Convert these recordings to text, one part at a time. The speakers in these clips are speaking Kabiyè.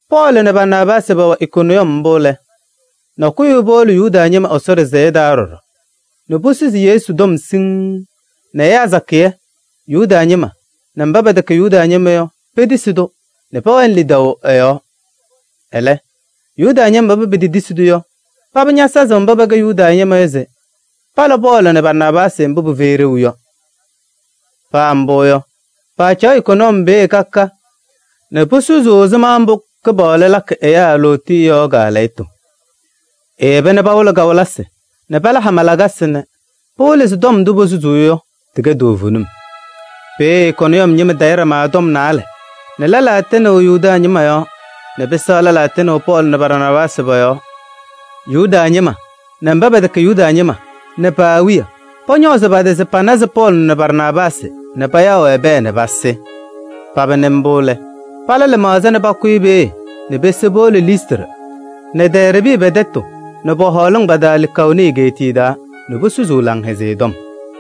Pɔɔlɩ nɛ Barnaabaasɩ pɛwɛ Ikoniyɔm mbʋ lɛ, nakʋyʋ wiye powolo Yuda ñɩma Ɛsɔ ɖɩsɛyɛ taa ɖɔɖɔ nɛ posusi Yesu tɔm siŋŋ nɛ ɛyaa sakɩyɛ: Yuda ñɩma nɛ mba pɛtɛkɛ Yuda ñɩma yɔ petisi-tʋ nɛ pɛwɛnɩ lidaʋ ɛ-yɔɔ. Ɛlɛ, Yuda ñɩma mba petetisi-tʋ yɔ, paba ñasazɩ mba pɛtɛkɛ Yuda ñɩma yɔ se pala Pɔɔlɩ nɛ Barnaabaasɩ mbʋ pɩfɛyɩ ɖeu yɔ. Paa mbʋ yɔ, paacaɣ Ikoniyɔm peeye ka ka nɛ posusuu ɛzɩma mbʋ Kɩpaɣlʋ lakɩ ɛyaa lootiye yɔ kaalɛyɩtʋ. Eyeba nɛ pawɩlɩ kawɩlɩsɩ nɛ pala hama lakasɩ nɛ pɩwɩlɩ se tɔm ndʋ posusuu yɔ, tɩkɛ toovenim. Peeye Ikoniyɔm ñɩma tayɩ ɖama tɔm naalɛ nɛ lɛlaa tɩnɩ Yuda ñɩma yɔɔ nɛ pɩsɛɣ lɛlaa ñatɩnɩ Pɔɔlɩ nɛ Barnaabaasɩ pɔ-yɔɔ. Yuda ñɩma nɛ mba pɛtɛkɛ Yuda ñɩma yɔ nɛ pa-awiya, pɔñɔɔzɩ pa-tɩ se panazɩ Pɔɔlɩ nɛ Barnaabaasɩ nɛ payaɣ-wɛ pɛɛ nɛ pasɩ. Paba nɩ mbʋ lɛ, pala lɩmaɣza nɛ pakʋyɩ peeye nɛ pese powolo Listrɩ nɛ Dɛɛrbɩ pɛ-tɛtʋ nɛ pɔ-hɔɔlɩŋ pa-taa Likaoni egeetiye taa nɛ posusuu Laŋhɛzɩyɛ Tɔm.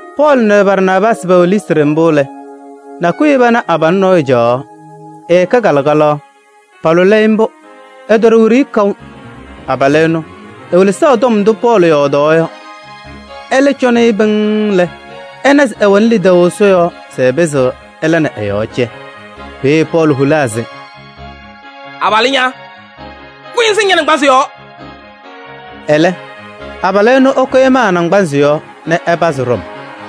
Pɔɔlɩ nɛ Barnaabaasɩ pɛwɛ Listrɩ mbʋ lɛ, nakʋyʋ wiye pana abalʋ nɔɔyʋ caɣaɣ, ɛkɛ kalɩkalaɣ. Paalʋlɩ-ɩ mbʋ, ɛtɔɖɔ wiɖiyi kaʋ. Abalʋ ɛnʋ ewelesaɣ tɔm ndʋ Pɔɔlɩ yɔɔdaɣ yɔ. Ɛlɛ cɔnɩ-ɩ pɩŋŋ lɛ, ɛna se ɛwɛnɩ lidaʋ Ɛsɔ yɔɔ se ɛpɩzɩɣ ɛla nɛ ɛ-yɔɔ cɛ. Peeye Pɔɔlɩ holaa se: “Abalʋ ña, kʋyɩ ŋsɩŋ ña-naŋgbanzɩ yɔɔ!” Ɛlɛ abalʋ ɛnʋ, ɛkʋyɩ ɛmaa ɛ-naŋgbanzɩ yɔɔ nɛ ɛpazɩ ɖɔm.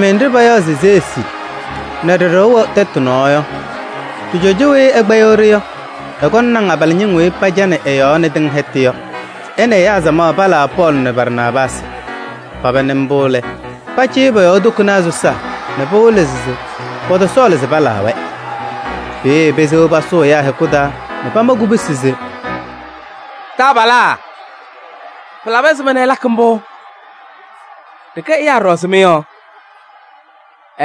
Ɛgɔlɩmɩyɛ nɖɩ payaɣ se Zeesi nɛ ɖɩ-ɖɩɣa wɛ tɛtʋ nɔɔ yɔ, ɖɩ-cɔjɔ weyi ɛkpɛyɩɣ-ɖɩ yɔ, ɛkɔnɩ naŋ abalɩñɩŋ weyi pacanɩ ɩ-yɔɔ nɛ tɩŋ hɛtʋ yɔ se ɛ nɛ ɛyaa samaɣ palaa Pɔɔlɩ nɛ Barnaabaasɩ. Paba nɩ mbʋ lɛ, pacɩyɩ pɔ-yɔɔ tokonaa sɔsaa nɛ pɩwɩlɩ se pɔtɔsɔɔlɩ se palaa-wɛ. Peeye pesewa pasʋʋ ɛyaa hɛkʋ taa nɛ pamakɩ kubusi se: “Taabalaa, pɩlabɩ ɛzɩma nɛ ɩlakɩ mbʋ? Ɖɩkɛ ɛyaa ɖɔɖɔ ɛzɩ mɩ yɔ.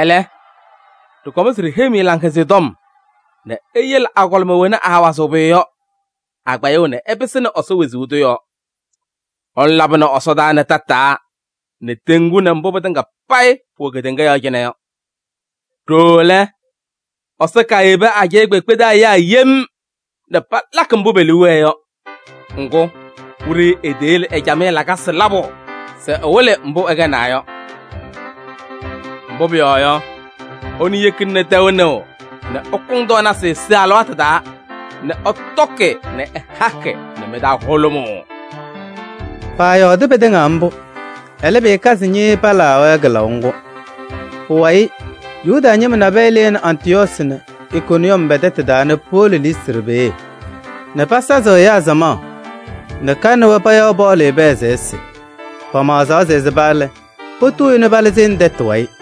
Ɛlɛ, ɖɩkɔm se ɖiheyi-mɩ Laŋhɛzɩyɛ Tɔm nɛ iyele agɔlɩma wena aawazɩɣ pʋyʋ yɔ, a-kpɛyʋʋ nɛ ɩpɩsɩnɩ Ɛsɔ wezuu tʋ yɔɔ. Ɛnʋ labɩnɩ ɛsɔdaa nɛ tataa nɛ teŋgu nɛ mbʋ pɩtɩŋa payɩ pʋwɛ kedeŋa yɔɔ cɩnɛ yɔ. Ɖooo lɛ, Ɛsɔ kaayebi ajɛɛ kpeekpe taa ɛyaa yem nɛ palakɩ mbʋ pe-liu wɛɛ yɔ. Ŋgʋ, wiɖiyi eteyele ɛ-camɩyɛ lakasɩ labʋ se ɛwɩlɩ mbʋ ɛkɛnaa yɔ. Mbʋ pʋyɔɔ yɔ, ɛnʋ yekina nɛ tɛʋ nɩɣ nɛ ɩkʋŋ tɔɔnasɩ sɩ-alɩwaatʋ taa nɛ ɩtɔkɩ nɛ ɩhakɩ nɛ mɩ-taa hʋlʋmʋʋ.” Paayɔɔdɩ pɩtɩŋa mbʋ, ɛlɛ, pɩkazɩ ñɩɩɩ palaɣaɣ-wɛ kɩlaʋ ŋgʋ. Pʋwayɩ Yuda ñɩma nabɛyɛ lɩnɩ Antɩyɔɔsɩ nɛ Ikoniyɔm pɛ-tɛtʋ taa nɛ powolo Listrɩ peeye nɛ pasazɩ ɛyaa samaɣ nɛ ka nɛ wɛ payaɣ Pɔɔlɩ pɛɛ se ɛsɩ. Pamaɣzaa se ɛsɩba lɛ, potuu-i nɛ palɩzɩ nɛ tɛtʋ wayɩ.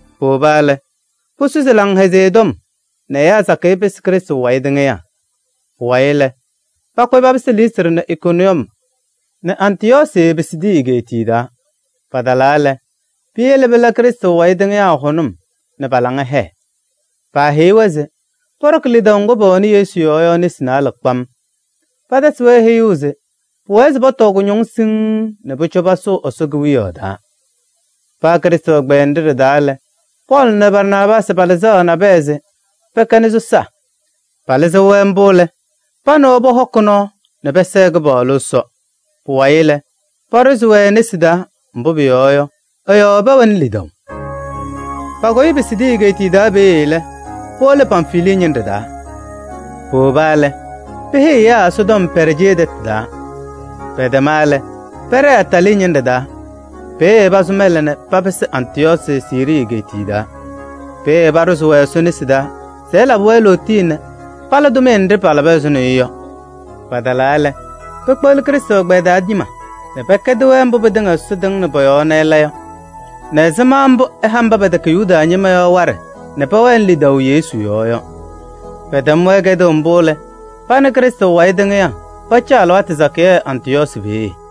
Powoba lɛ, posusi Laŋhɛzɩyɛ Tɔm nɛ ɛyaa sakɩyɛ pɩsɩ Krɩstʋ wayɩ tɩŋɩyaa. Pʋwayɩ lɛ, pakʋyɩ papɩsɩ Listrɩ nɛ Ikoniyɔm nɛ Antɩyɔɔsɩ, Pisidii egeetiye taa. Patalaa lɛ, peyele pɩla peeye Krɩstʋ wayɩ tɩŋɩyaa hʋnʋm nɛ pa-laŋa hɛɛ. Paaheyi-wɛ se pɔɖɔkɩ lidaʋ ŋgʋ pɛwɛnɩ Yesu yɔɔ yɔ nesi naalɛ kpam. Paatasɩ-wɛ heyuu se pʋwɛɛ se pɔtɔɔ kʋñɔŋ siŋŋ nɛ pʋcɔ pasʋʋ Ɛsɔ Kewiyaɣ taa. Paa Krɩstʋ ɛgbɛyɛ nɖɩ ɖɩ-taa lɛ, Pɔɔlɩ nɛ Barnaabaasɩ palɩzaɣ nabɛyɛ se pɛkɛnɩ sɔsaa. Palɩzɩɣ-wɛ mbʋ lɛ, pa nɛ wɛ pɔhɔkɩ nɔɔ nɛ pɛsɛɛ Kɩpaɣlʋ Ɛsɔ. Pʋwayɩ lɛ, paɖʋzɩ-wɛ e-nesi taa, mbʋ pʋyɔɔ yɔ, ɛ-yɔɔ pɛwɛnɩ lidaʋ. Pakʋyɩ Pisidii egeetiye taa peeye lɛ, powolo Pamfilii ñɩnɖɛ taa. Powoba lɛ, peheyi ɛyaa Ɛsɔtɔm Pɛɛrjee tɛtʋ taa, pɛtɛma lɛ, pɛɖɛɛ Atalii ñɩndʋ taa. Peeye pasʋ mɛlɛ nɛ papɩsɩ Antɩyɔɔsɩ, Siirii egeetiye taa. Peeye paaɖʋzɩ-wɛ Ɛsɔ nesi taa se ɛlabɩ-wɛ lootiye nɛ pala pa-tʋmɩyɛ nɖɩ palaba ɛzʋnɔ yɔ. Patalaa lɛ, pekpeɣli Krɩstʋ ɛgbɛyɛ taa ñɩma nɛ pɛkɛdɩ-wɛ mbʋ pɩtɩŋa Ɛsɔ tɩŋnɩ pɔ-yɔɔ nɛ ɛla yɔ nɛ ɛzɩma mbʋ ɛha mba pɛtɛkɛ Yuda ñɩma yɔ waɖɛ nɛ pɛwɛnɩ lidaʋ Yesu yɔɔ yɔ. Pɛtɛm-wɛ kɛdʋʋ mbʋ lɛ, pa nɛ Krɩstʋ wayɩ tɩŋɩyaa pacaɣ alɩwaatʋ sakɩyɛ Antɩyɔɔsɩ peeye.